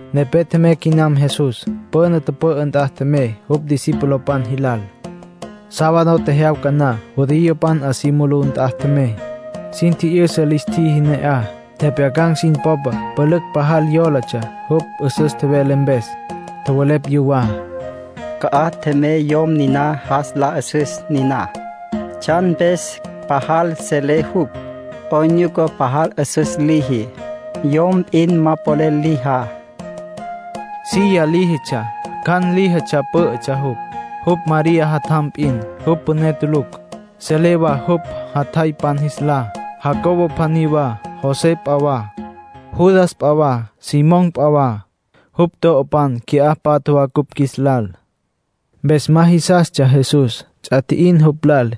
Nepé tjemey quinam Jesús. Püna tüpü'ü nt'a tjemey jupj discipulopan jilal. Sábado tjejyawca na, judiopan 'a si mulú nt'a tjemey. Sin tji'yüsa lis tjiji ne'aj. Tjepjyacan̈ sin popa pülücj pajal yólatsja jupj 'üsüs tjevele mpes. Tjowelepj yuwá: —¿Ca'aj tjemey yom niná jas la 'üsüs niná? ¿Tsjan mpes pajal selé jupj? ¿'Oyn nyuca pajal 'üsüs liji, yom p'in ma polel lijá? Silla líjitsja, cjan líjitsja pǘ'ütsja jupj. Jupj María jatjam p'in. Jupj püné tulucj. Selecj wa jupj jatjaypan jis lá: Jacobo pjaní wa, José p'a wa, Judas p'a wa, Simón p'a wa. Jupj to'opan qui'á patja wa cupj qjuis lal —nin tjowelepj yuwá. Mpes ma jisastsja Jesús. Ts'a tji'in jupj lal.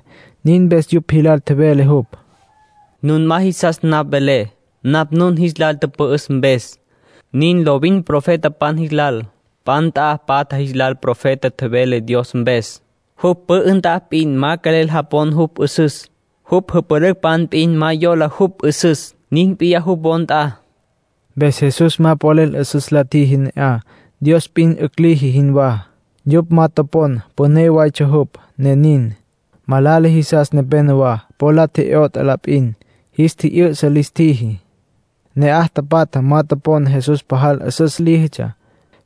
Nin mpes yupj jilal tjevele jupj: —Nun ma jisas napj velé, napj nun jis lal tüpü'üs mpes. Nin lovin profetapan jis lal. P'a nt'a patja jisas profeta vele Dios mpes. Jupj pü'ü nt'a p'in ma quelel japon jupj 'üsüs. Jupj jüpülücpan p'in ma yola jupj 'üsüs. Nin p'iyá jupj wo nt'a —tjevele Jesús. Mpes Jesús ma polel 'üsüs la tjiji ne'aj, Dios p'in 'ücj liji jinwá. Yupj ma topon püné waytsja jupj, ne nin. Malala jisas nepenowá po la tje'yot'a la p'in. Jis tji'yü'sa lis tjiji. Ne'aj tapatja ma topon Jesús pajal 'üsüs líjitsja.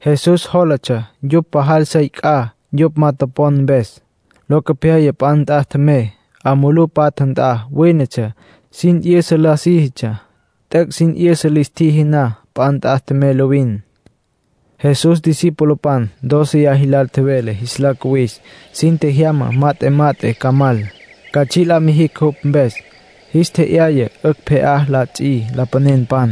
Jesús jólatsja yupj pajal sey c'a, yupj ma topon mpes. Locopyaya p'a nt'a tjemey. 'A mulú patja nt'a wínetsja, sin 'yüsa la síjitsja. T'üc' sin 'yüsa lis tjiji na, p'a nt'a tjemey lovin. Jesús discipulopan dóceya jilal tjevele jis la cuwis. Sin tjejyama, mat'e mat'e ca mal, ca tsji' la mijicj jupj mpes. Jis tje'yaya 'ücj pje'á la ts'i lapanenpan.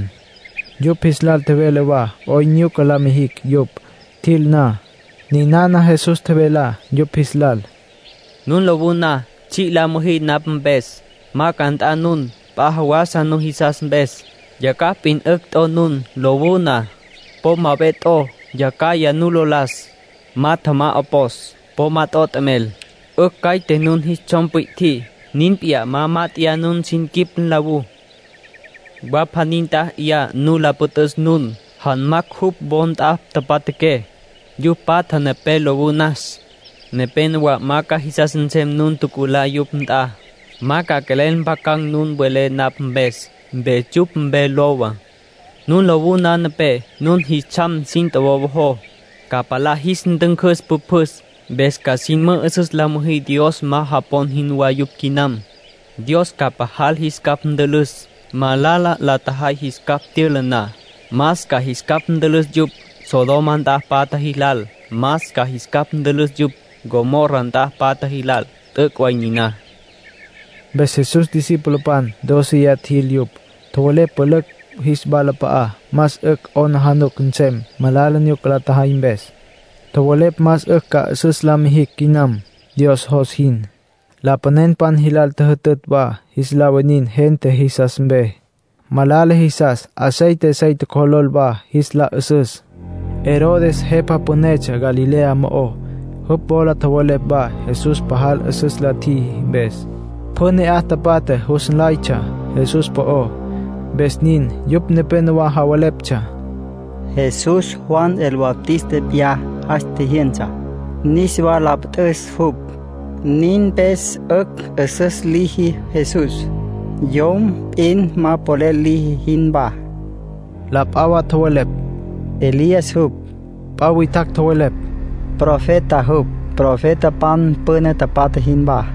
Yupj jis lal tjevele wa 'oyn nyuca la mijicj yupj, tjil na. Ninana Jesús tjevelá yupj jis lal: “Nun lowú na tsji' la müjí napj mpes, ma ca nt'a nun p'a jawasa nujisas mpes. Tjacjaj p'in 'ücj t'o nun, lowú na. Po ma ve t'o, yacjaya nu lo las. Ma tjamá 'opos. Po ma t'o t'emel. 'Ücj caite nun jis tsjom pwi'tjí, nin p'in ma mát'eya nun sin quip nlawú. Wa pjaní nt'a 'yaya nu la püt'üs nun, janmacj jupj wo nt'a tapatjaqué, yupj patja nepé lowú nas. Nepénowa ma ca jisas nsem nun tjuculá yupj nt'a. Ma ca quelel mpjacan̈ nun welé napj mpes. Mpes yupj mpe lowa. Nun lowú na nepé, nun jis tsjam sin tjowowojó, ca palá jis ntüncüs pjüpjüs. Mpes ca sin mü'üsüs la müjí Dios ma japon jinwá yupj quinam. Dios ca pajal jis capj ntülüs, malala la tjajay jis capj tyüla na. Más ca jis capj ntülüs yupj, Sodoma nt'a tapatja jilal. Más ca jis capj ntülüs yupj, Gomorra nt'a tapatja jilal. T'üc' way niná”, nin tjevele Jesús. Mpes Jesús discipulopan dóceya tjil yupj. Tjowelepj pülücj jis walap'a'á más 'ücj yupj ca 'aplijila nsem malala nyuca la tjajay mpes. Tjowelepj más 'ücj ca 'üsüs la mijicj quinam Dios jos jin. Lapanenpan jilal tjüjütütj wa jis la winin gente jisas mpe. Malala jisas aceite sey tjocjolol wa jis la 'ü'süs. Herodes jepa pünetsja Galilea mo'ó. Jupj wola tjowelepj wa Jesús pajal 'üsüs la tjiji mpes. Pjü ne'aj tapatja jus nlaytsja Jesús po'ó, mpes nin. Yupj nepénowa javeleptsja: “Jesús Juan el Bautista p'iyá. Jas tjijyünsa, niswa la püt'üs jupj. Nin mpes 'ücj 'üsüs liji Jesús, yom p'in ma polel liji jinwá.” La p'a wa tjowelepj: “Elías jupj”. P'a witjacj tjowelepj: “Profeta jupj, profetapan püna tapatja jinwá”.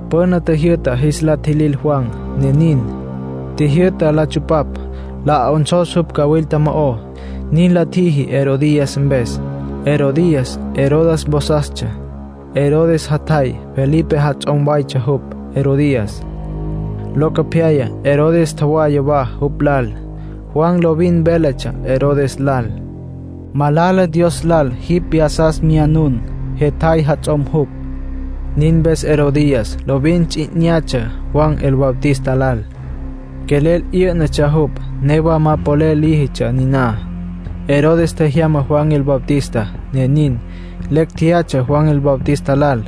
Püna tjijyü'ta jis la tjilil Juan, ne nin. Tjijyü'ta la tsupapj, la 'onsos jupj cawilta mo'ó. Nin la tjiji Herodías mpes. Herodías Herodes vosastsja. Herodes jatjay Felipe jats'om waytsja jupj, Herodías. Locopyaya Herodes tjowaya wa jupj lal. Juan lovin véletsja Herodes lal: “Malala Dios lal jipj vyasas myanun. Jetjay jats'om jupj.” Nin mpes Herodías lovin ts'i 'inyatsja Juan el Bautista lal. Quelel 'yǘ'natsja jupj, newa ma polel líjitsja niná. Herodes tjejyama Juan el Bautista, ne nin. Lecj tjeyatsja Juan el Bautista lal.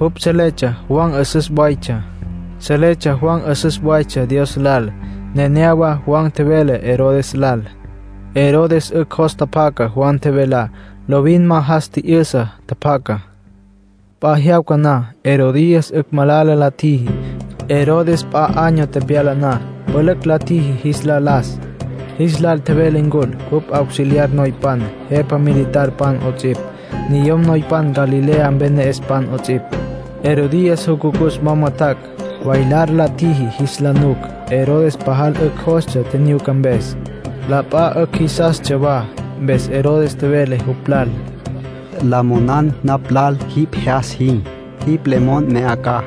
Jupj seletsja Juan 'üsüs waytsja. Seletsja Juan 'üsüs waytsja Dios lal. Nenéyawa Juan tjevele Herodes lal. Herodes 'ücj jos tjapjaca Juan tjevelá, lovin ma jas tji'yüsa tjapjacá. P'a jyawca na, Herodías 'ücj malala la tjiji. Herodes p'a año tepyala na, pülücj la tjiji jis la las. Jis lal tjevele ncul jupj auxiliar noypan, jepa militarpan 'ots'ipj, niyom noypan Galilea mpe ne'espan 'ots'ipj. Herodías jucucus wama tjac', bailar la tjiji jis la nuc. Herodes pasal 'ücj jostsja tjinyuca mpes, la p'a 'ücj jisastsja wa. Mpes Herodes tjevele jupj lal: —La monan napj lal jipj jyas jin. Jipj le mon mya 'a ca.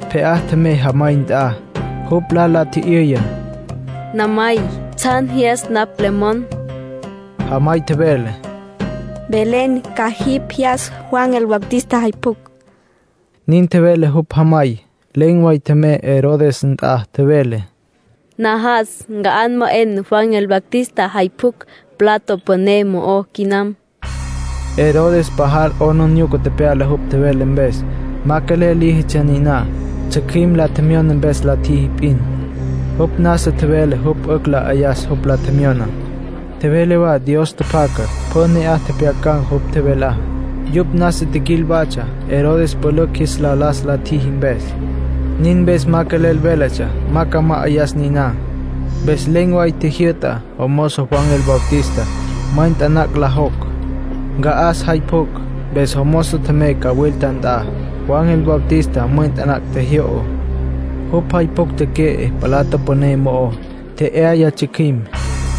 Pje'á tjemey jamay nt'a. Jupj lal la tji'yüya: —¿Namay, tsjan jyas napj le mon? Jamay tjevele: —Mvelen ca jipj jyas Juan el Bautista jay pjucj —nin tjevele jupj jamay. Len̈ way tjemey Herodes nt'a, tjevele: —Najas nca'an ma 'en Juan el Bautista jay pjucj plato püné mo'ó quinam —nin tjevele jupj. Herodes pajal 'aplijila tepyala jupj tjevele mpes. Ma quelel líjitsja niná, tsjücjüim la tjemyona mpes la tjiji p'in. Jupj nasa tjevele jupj 'ücj la 'ayas jupj la tjemyoná. Tjevele wa Dios tjapjaca. Pjü ne'aj tjepjyacan̈ jupj tjevelá. Yupj nasa tjiquil watsja, Herodes pülücj jis la las la tjiji mpes. Nin mpes ma quelel véletsja ma ca ma'ayas niná. Mpes len̈ way tjijyü'ta jomozo Juan el Bautista mwen taná la jocj, nca'as jay pjucj. Mpes jomozo tjemey cawilta nt'a. Juan el Bautista mwen taná tjejyo'o. Jupj jay pjucj teque'e plato püné mo'ó, tje'yaya tsjücjüim.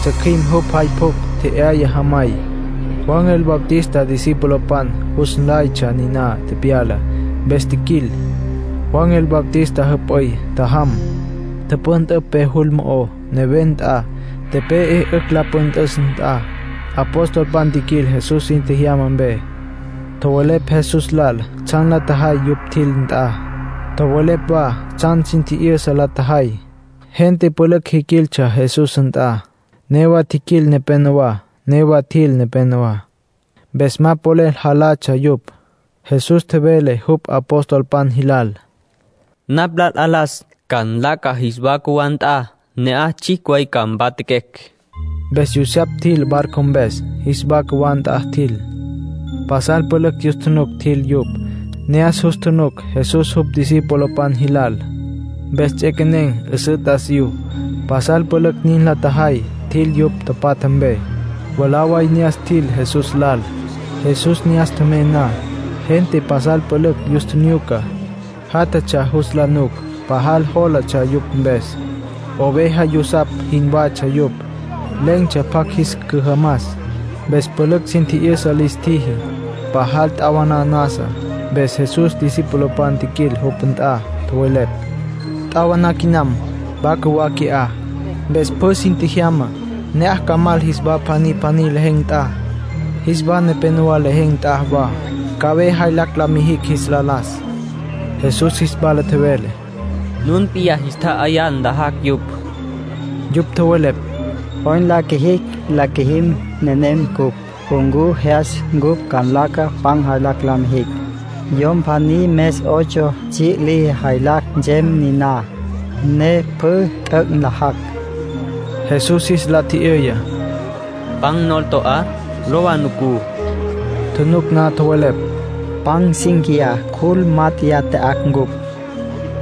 Tsjücjüim jupj jay pjucj tje'yaya jamay. Juan el Bautista discipulopan jus nlaytsja niná tepyalá, mpes tjiquil. Juan el Bautista jüp'üy tjajam, tüpüntüpj pe jul mo'ó, neven nt'a, tepe'e 'ücj la püntüs nt'a. Apostolpan tjiquil Jesús sin tjejyama mpe. Tjowelepj Jesús lal tsjan la tjajay yupj tjil nt'a. Tjowelepj wa tsjan sin tji'yüsa la tjajay. Gente pülücj jiquiltsja Jesús nt'a. Newa tjiquil nepenowá, newa tjil nepenowá. Mpes ma polel jalatsja yupj. Jesús tjevele jupj apostolpan jilal: —Napj lal 'alas. Ca nlaca jis wa cjuwá nt'a, ne'aj tsjicj way ca mpatjaquecj. Mpes yusapj tjil barco mpes, jis wa cjuwá nt'a tjil. Pasal pülücj yus tjunuc tjil yupj. Ne'as jus tjunuc Jesús jupj discipulopan jilal. Mpes ts'equenen̈ 'üsǘ t'asiyú. Pasal pülücj nin la tjajay, tjil yupj tapatja mpe. Mwalá way ne'as tjil Jesús lal. Jesús ne'as tjemey na, gente pasal pülücj yus tjinyuca, játjatsja jus la nuc. Pajal jólatsja yupj mpes. Oveja yusapj jinwatsja yupj, len̈tsja pjacj jis cüjamas. Mpes pülücj sin tji'yüsa lis tjiji. Pajal t'awaná nasa. Mpes Jesús discipulopan tjiquil jupj nt'a, tjowelepj: —T'awaná quinam. Wa cjuwá qui'á. Mpes pjü sin tjejyama, ne'aj ca mal jis wa pjaní pjaní lejen̈ nt'a, jis wa nepénowa lejen̈ nt'a wa. Ca ve jaylacj la mijicj jis la las —nin tjowelepj yupj. Jesús jis wala tjevele: —Nun p'iyá jis tja'ayá, nlajacj yupj. Yupj tjowelepj: —¿'Oyn la qjuijicj la qjuijim nenem cupj? ¿Ncu jyas cupj ca nlaca ca pan jaylacj la mijicj? Yom pjaní mes ocho tsji' liji jaylacj nsem niná, ne pjü t'üc' nlajacj. Jesús jis la tji'yüya: —¿Pan nol to'á? Lowa nucú —tjevele. Tjunuc na, tjowelepj: —Pan cinquiyá, cjul mát'eya tya'acj cupj.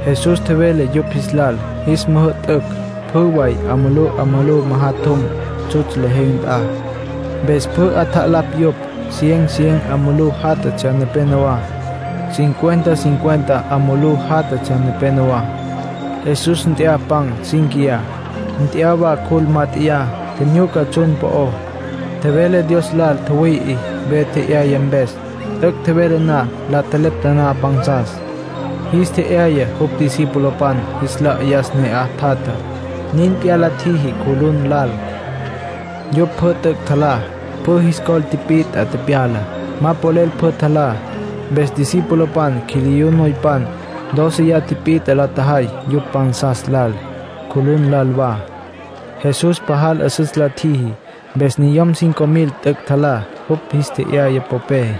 Jesús tjevele yupj jilal jis müjü'tücj pjü way 'a mulú 'a mulú majatjum tsjutsj lejen̈ nt'a. Mpes pjü 'atjalapj yupj. Cien cien 'a mulú játjatsja nepenowá. Cincuenta cincuenta 'a mulú játjatsja nepenowá. Jesús nt'ya pan cínquiya, nt'ya wa cjul mát'eya. Tjinyuca tsjun po'ó, tjevele Dios lal tjüwüi'i ve tje'yaya mpes. T'üc' tjevele na, la tjelepta taná pansas. Jis tje'yaya jupj discipulopan jis la 'ayas ne'aj tjatjá. Nin p'iyá la tjiji cjulun lal. Yupj pjü t'üc' tjalá. Pjü jis col tipit'a tepyala. Ma polel pjü tjalá. Mpes discipulopan quiliyú noypan dóceya tipit'a la tjajay yupj pansas lal, cjulun lal wa. Jesús pajal 'üsüs la tjiji, mpes niyom cinco mil t'üc' tjalá jupj jis tje'yaya popé.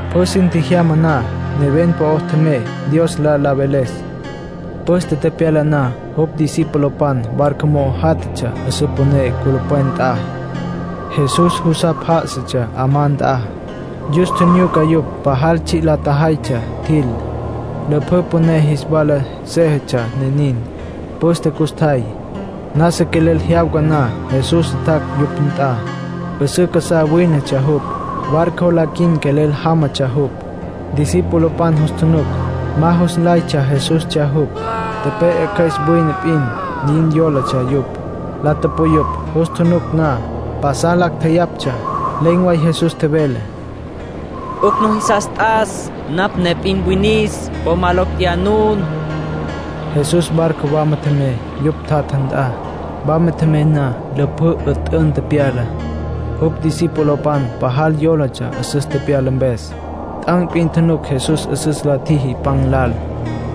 Pjü sin tjejyama na, neven po'ó tjemey, Dios lal la veles. Püste tepyala na, jupj discipulopan barco mo'o játjatsja 'üsǘ püné culupwen nt'a. Jesús jusapj já'asatsja 'amá nt'a. Yus tjinyuca yupj pajal tsji' la tjajaytsja tjil. Lüpjǘ püné jis wala séjetsja, ne nin. Pǘstetsja custjay. Nasa quelel jyawca na, Jesús tjac' yupj nt'a. 'Üsǘ casá wínetsja jupj. Barco la quin quelel jámatsja jupj. Discipulopan jus tjunuc, ma jus nlaytsja Jesustsja jupj. Tepe'e cjües wine p'in, nin yólatsja yupj. La tupuyupj jus tjunuc na. Pasal lacj tjeyaptsja. Len̈ way Jesús tjevele: “'Ücj nujisas t'as. Napj ne p'in winis. Po ma locj tjeyá nun.” Jesús barco wama tjemey yupj tjatja nt'a. Wama tjemey na, lüpjǘ 'üt'ün tepyala. Jupj discipulopan pajal yólatsja 'üsüs tepyala mpes. T'an̈ p'in tjunuc Jesús 'üsüs la tjiji pan lal.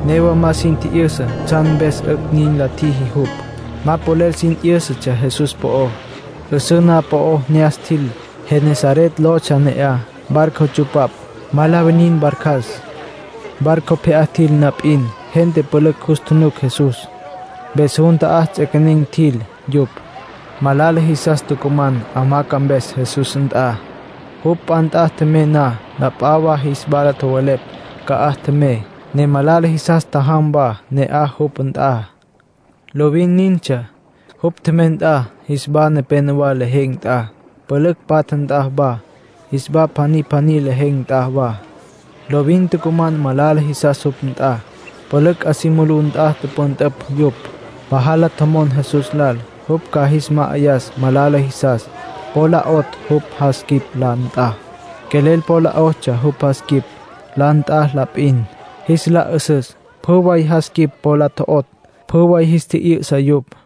Newa ma sin tji'yüsa tsjan mpes 'ücj nin la tjiji jupj. Ma polel sin 'yǘsatsja Jesús po'ó. 'Üsǘ na'aj po'ó ne'as tjil, Genesaret lotsja ne'aj. Barco tsupapj, ma la winin barcas. Barco pje'á tjil na p'in, gente pülücj jus tjunuc Jesús. Mpes jun ta'á ts'equenen̈ tjil yupj, malala jisas tucuman hamaca mpes Jesús nt'a. Jupj p'a nt'a tjemey na, la p'a wa jis wala tjowelepj ca'aj tjemey, ne malala jisas tjajam wa ne'aj jupj nt'a. Lovin nintsja. Jupj tjemey nt'a, jis wa nepénowa lejen̈ nt'a, pülücj patja nt'a wa, jis wa pjaní pjaní lejen̈ nt'a wa, lovin tucuman malala jisas jupj nt'a. Pülücj 'a si mulú nt'a tüpüntüpj yupj. Pajal la tjomon Jesús lal jupj ca jis ma'ayas malala jisas po la 'otj jupj jas quip la nt'a. Quelel po la 'otsja jupj jas quip la nt'a la p'in, jis la 'ü'süs. Pjü way jas quip po la tjo'otj, pjü way jis tji'yü'sa yupj.